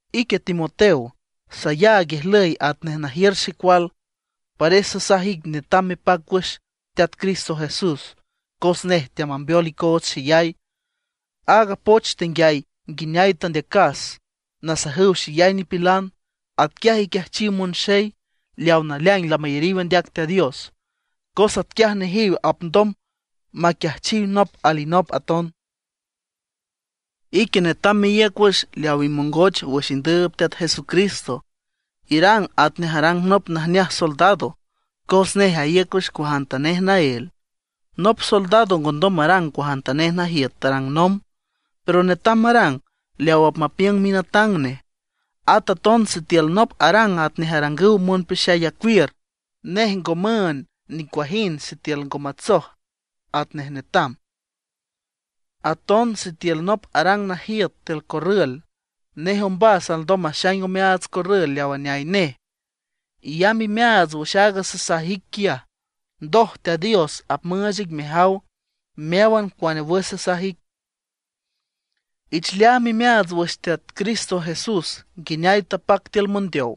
Ique Timoteo, sayaag ijlüy atnej najiür xecual, pares sasaj ic netam mepac wüx Teat Cristo Jesús cos nej teamambeol icoots xeyay. Aaga poch tenguiay nguineay tandeacas nasajüw xeyay nipilan, atquiaj iquiajchiw monxey leaw naleaing lamayariw andeac Teat Dios, cos atquiay nejiw apndom maquiajchiw nop alinop aton. Ique netam meíüc wüx leaw imongoch wüx indüüb Teat Jesucristo. Irang atnej arang nop najneaj soldado, cos nej aíüc wüx cuajantanej naél. Nop soldado ngondom marang cuajantanej najiüt tarang nomb, pero netam marang leaw apmapiüng minatang nej. At aton sitiül nop arang atnej arangüw monpeaxay acuiür, nej ngo müünd nicuajind sitiül ngo matsoj atnej netam. Aton sitiül nop arang najiüt tiül corrül, nej ombas alndom maxaing omeaats corrül leaw aneay nej. Iyamb imeaats wüx aaga sasaj ic quiaj, ndoj Teat Dios apmüüch ic mejaw meáwan cuane wüx sasaj ic. Ich leaam imeaats wüx Teat Cristo Jesús nguineay tapac tiül mondeow.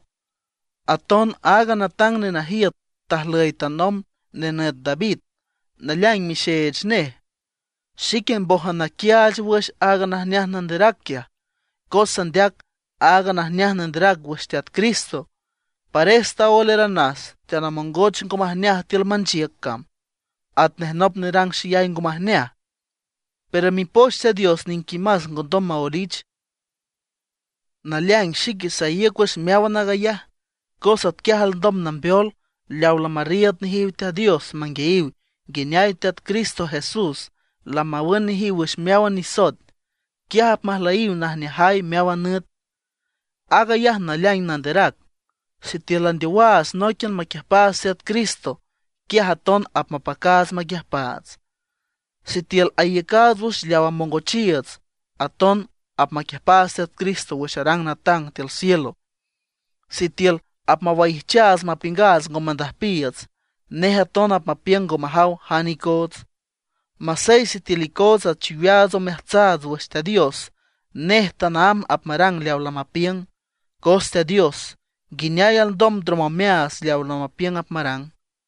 Aton aaga natang nenajiüt tajlüy tanomb, nenüt David, naleaing mixeech nej. Xique mbójan naquiaach wüx aaga najneaj nanderac quiaj. Cos sandeac aaga najneaj nanderac wüx Teat Cristo, pares taoelaranas, teanamongoch ngo majneaj tiül manchiüc cam atnej nop nerang xeyay ngo majneaj. Pero Mipoch Teat Dios niquimas ngondom maoelich. Naleaing xique saíüc wüx meáwan aag ayaj, cos atquiaj alndom nambeol leawa lamarriiüd nejiw Teat Dios manguiayiw nguineay Teat Cristo Jesús lamawün nejiw wüx meáwan nisoet, quiaj apmajlüyiw najneajay meáwan nüt. Aag ayaj naleaing nanderac: Sitiül landeowaats nóiquian maquiüjpaats Teat Cristo, quiaj aton apmapacaats maquiüjpaats; sitiül aiücaats wüx leaw amongochiiüts, aton apmaquiüjpaats Teat Cristo wüx arang natang tiül cielo. Sitiül apmawaijchaats mapiüngaats ngo mandüjpiiüts, nej aton apmapiüng ngo majaw jane icoots. Masey sitiül icoots achiweaats omeajtsaats wüx Teat Dios, nej tanaámb apmarang leawa lamapiüng, cos Teat Dios, ¿nguineay alndom ndrom omeaats leaw lamapiüng apmarang?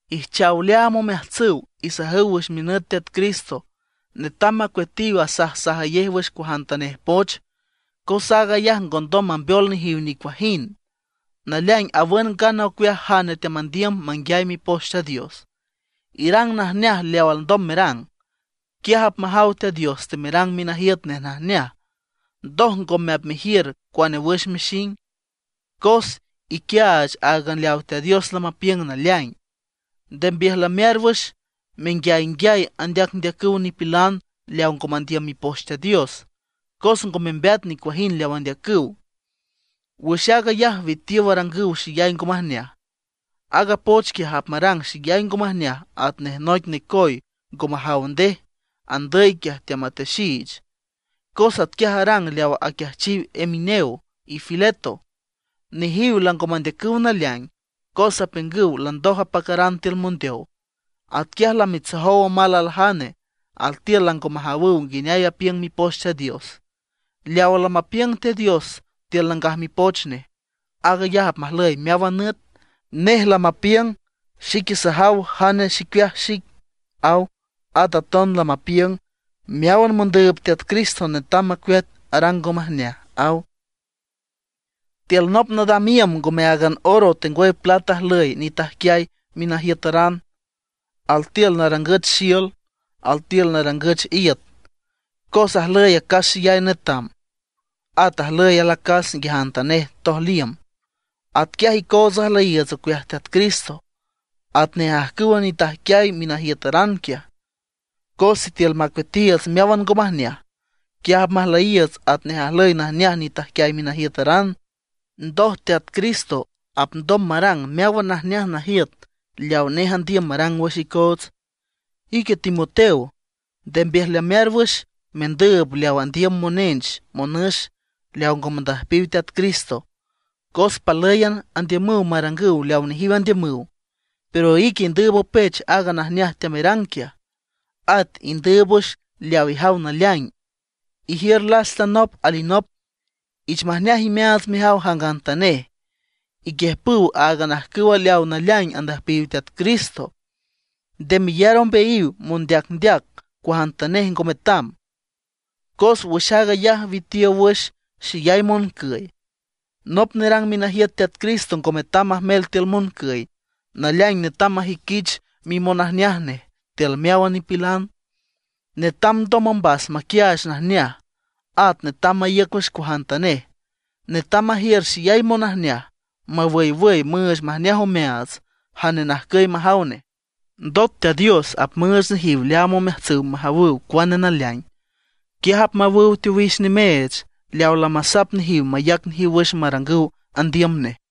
Ijchaw leaam omeajtsüw, isajüw wüx minüt Teat Cristo netam macueatiw asajsajayej wüx cuajantanej poch. Cos aag ayaj ngondom mambeol nejiw nicuajind. Naleaing awün ngana ocueaj jane teamandiüm manguiay Mipoch Teat Dios. Irang najneaj leaw alndom merang, quiaj apmajaw Teat Dios temerang minajiüt nej najneaj. Ndoj ngome apmejiür cuane wüx mexing, cos iquiaach áagan leaw Teat Dios lamapiüng naleaing. Nde mbiüjlamear wüx menguiaynguiay andeacndeacüw nipilan leaw ngo mandiüm Mipoch Teat Dios, cos ngo membeat nicuajind leaw andeacüw. Wüx aag ayaj witiow arangüw xeyay ngo majneaj. Aaga poch quiaj apmarang xeyay ngo majneaj atnej noic necoy ngo majaw ndej, andüy quiaj teamatexiich. Cos atquiaj arang leaw aquiajchiw Himeneo y Fileto. Nejiw lango mandeacüw naleaing, cos apiüngüw landoj apacaran tiül mondeow. Atquiaj lamitsojow omal aljane; altiül lango majawüw nguineay apiüng Mipoch Teat Dios. Leawa lamapiüng Teat Dios tiül Nangaj Mipoch Nej, aag ayaj apmajlüy meáwan nüt. Nej lamapiüng: “Xique sajaw jane xicueaj xique”, aw. At aton lamapiüng: “Meáwan mondüüb Teat Cristo netam macueat arang ngo majneaj”, aw. Tiül nop nadam iüm ngome áagan oro tengwüy plat ajlüy nitajquiay minajiütaran; altiül narangüch xiül, altiül narangüch iüt. Cos ajlüy acas xeyay netam, at ajlüy alacas nguiajantanej tojliüm. Atquiaj icoots ajlüyiiüts ocueaj Teat Cristo, atnej ajcüwa nitajquiay minajiütaran quiaj. Cos sitiül macueatiiüts meáwan ngo majneaj, quiaj apmajlüyiiüts atnej ajlüy najneaj nitajquiay minajiütaran; ndoj Teat Cristo apndom marang meáwan najneaj najiüt leaw nej andiüm marang wüx icoots. Ique Timoteo, nde mbiüjlamear wüx mendüüb leaw andiüm monench monüx leaw ngo mandüjpiw Teat Cristo. Cos palǘyan andiümüw marangüw leaw nejiw andiümüw. Pero ique indüüb opech aaga najneaj teamerang quiaj. At indüüb wüx leaw ijaw naleaing, ijiür lasta nop alinop, ich majneaj imeaats mejaw jangantanej, iquiüjpüw áagan ajcüw leawa naleaing andüjpiw Teat Cristo. Nde meyar ombeayiw mondeacndeac cuajantanej ngo metam, cos wüx aag ayaj witiow wüx xeyay moncüy. Nop nerang minajiüt Teat Cristo ngo metam majmel tiül moncüy; naleaing netam majüiquich mimonajneaj nej tiül meáwan nipilan. Netam ndoj ombas maquiaach najneaj, at netam maíüc wüx cuajantanej. Netam majiür xeyay monajneaj mawüywüy müüch majneaj omeaats jane najcüy majaw nej, ndot Teat Dios apmüüch nejiw leaam omeajtsüw majawüw cuane naleaing. Quiaj apmawüw teowix nimeech leawa lamasap nejiw mayac nejiw wüx marangüw andiüm nej.